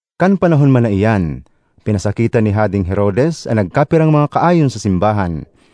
Kan panahon man na iyan, pinasakitan ni Hadeng Herodes an nagkapirang mga kaayon sa simbahan.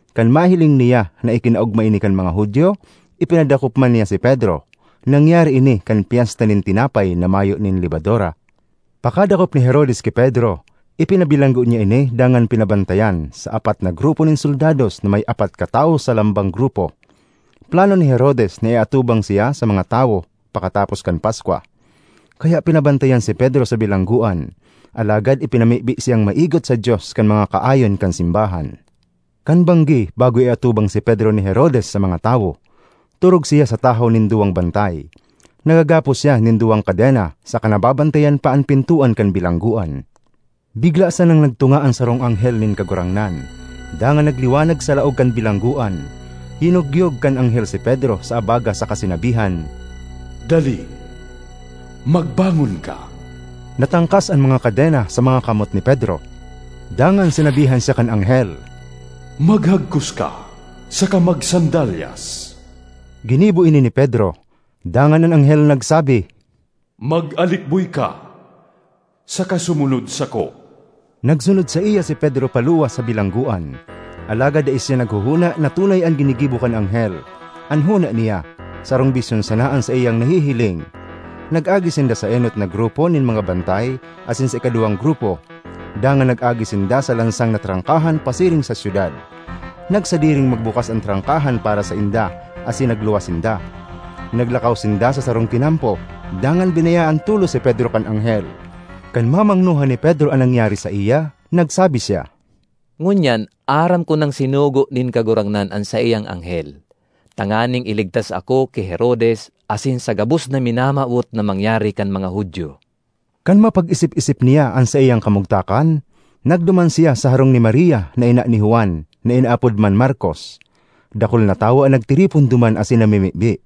Kan mahiling niya na ikinaogma ini kan mga Judio, ipinadakop man niya si Pedro. (Nangyari ini kan Pyesta nin Tinapay na Mayo nin Lebadura.) Pakadakop ni Herodes ki Pedro, ipinabilanggo niya ini dangan pinabantayan sa apat na grupo nin soldados na may apat katawo sa lambang grupo. Plano ni Herodes na iatubang siya sa mga tawo pakatapos kan Paskwa. Kaya pinabantayan si Pedro sa bilanggoan. Alagad ipinamibi siyang maigot sa Dios kan mga kaayon kan simbahan. Kan banggi bago iatubang si Pedro ni Herodes sa mga tawo, torog siya sa tahaw nin duwang bantay. Nagagapos siya nin duwang kadena saka nababantayan pa an pintoan kan bilanggoan. Bigla sanang nagtunga an sarong anghel nin Kagurangnan, dangan nagliwanag sa laog kan bilanggoan. Yinogyog kan anghel si Pedro sa abaga saka sinabihan, “Dali! Magbangon ka!” Natangkas an mga kadena sa mga kamot ni Pedro. Dangan sinabihan siya kan anghel, “Maghagkos ka saka magsandalyas!” Ginibo ini ni Pedro. Dangan an anghel nagsabi, “Mag-alikboy ka saka sumunod sako!” Nagsunod saiya si Pedro paluwas sa bilanggoan; alagad dai siya naghohona na tunay an ginigibo kan anghel; an hona niya, sarong bisyon sana an saiyang nahihiling. Nag-agi sinda sa enot na grupo nin mga bantay asin sa ikaduwang grupo, dangan nag-agi sinda sa lansang na trangkahan pasiring sa syudad. Nagsadiring magbukas an trangkahan para sainda asin nagluwas sinda. Naglakaw sinda sa sarong tinampo, dangan binayaan tolos si Pedro kan anghel. Kan mamangnohan ni Pedro an nangyari saiya, nagsabi siya, “Ngunyan aram ko nang sinugo nin Kagurangnan an saiyang anghel, tanganing iligtas ako ki Herodes asin sa gabos na minamawot na mangyari kan mga Judio.” Kan mapag-isip-isip niya an saiyang kamugtakan, nagduman siya sa harong ni Maria na ina ni Juan na inaapod man Markos. Dakul na tawo an nagtiripon duman asin namimibi.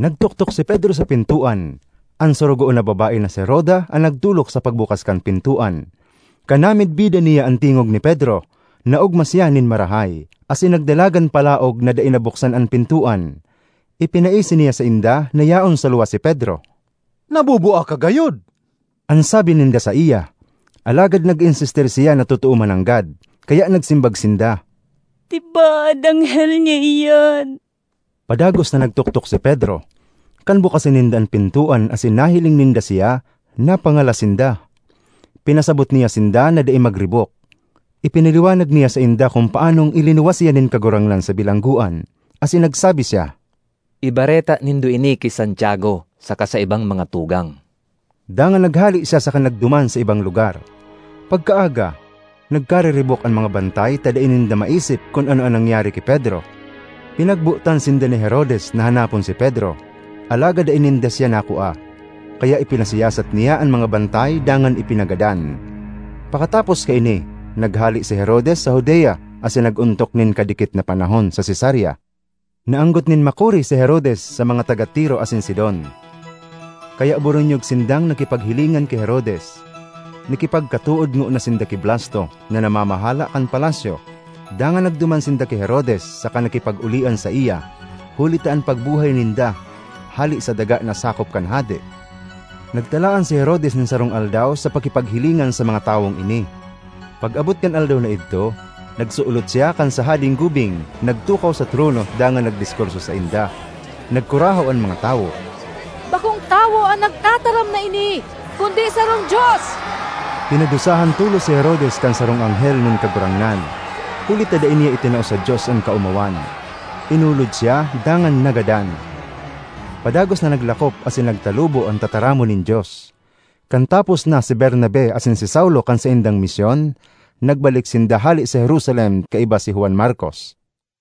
Nagtoktok si Pedro sa pintoan; an sorogoon na babae na si Roda an nagdolok sa pagbukas kan pintoan. Kan namidbidan niya an tingog ni Pedro, naogma siya nin marahay, asin nagdalagan palaog na dai nabuksan an pintoan. Ipinaisi niya sainda na yaon sa luwas si Pedro. ”Nabubua ka gayod!” an sabi ninda saiya, alagad nag-insistir siya na totoo mananggad. Kaya nagsimbag sinda, “Tibaad anghel niya iyan!” Padagos na nagtoktok si Pedro. Kan bukasan ninda an pintoan asin nahiling ninda siya, napangalas sinda. Pinasabot niya sinda na dai magribok. Ipinaliwanag niya sainda kun paanong ilinuwas siya nin Kagurangnan sa bilanggoan. Asin nagsabi siya, “Ibareta nindo ini ki Santiago saka sa ibang mga tugang.” Dangan naghale siya saka nagduman sa ibang lugar. Pagkaaga, nagkariribok an mga bantay ta dai ninda maisip kun ano an nangyari ki Pedro. Pinagbotan sinda ni Herodes na hanapon si Pedro, alagad dai ninda siya nakua. Kaya ipinasiyasat niya an mga bantay dangan ipinagadan. Pakatapos kaini, naghale si Herodes sa Judea asin nag-ontok nin kadikit na panahon sa Cesarea. Naanggot nin makuri si Herodes sa mga taga Tiro asin Sidon; kaya boronyog sindang nakipaghilingan ki Herodes. Nakipagkatood ngona sinda ki Blasto, na namamahala kan palasyo, dangan nagduman sinda ki Herodes saka nakipag-olian saiya, huli ta an pagbuhay ninda hale sa daga na sakop kan hade. Nagtalaan si Herodes nin sarong aldaw sa pakipaghilingan sa mga tawong ini. Pag-abot kan aldaw na idto, nagsulot siya kan sa hadeng-gubing, nagtukaw sa trono dangan nagdiskurso sainda. Nagkurahaw an mga tawo, “Bakong tawo an nagtataram na ini, kundi sarong dios!” Pinadusahan tolos si Herodes kan sarong anghel nin Kagurangnan, huli ta dai niya itinao sa Dios an kaomawan. Inulod siya dangan nagadan. Padagos na naglakop asin nagtalubo an tataramon nin Dios. Kan tapos na si Bernabe asin si Saulo kan saindang misyon, nagbalik sinda hale sa Jerusalem kaiba si Juan Markos.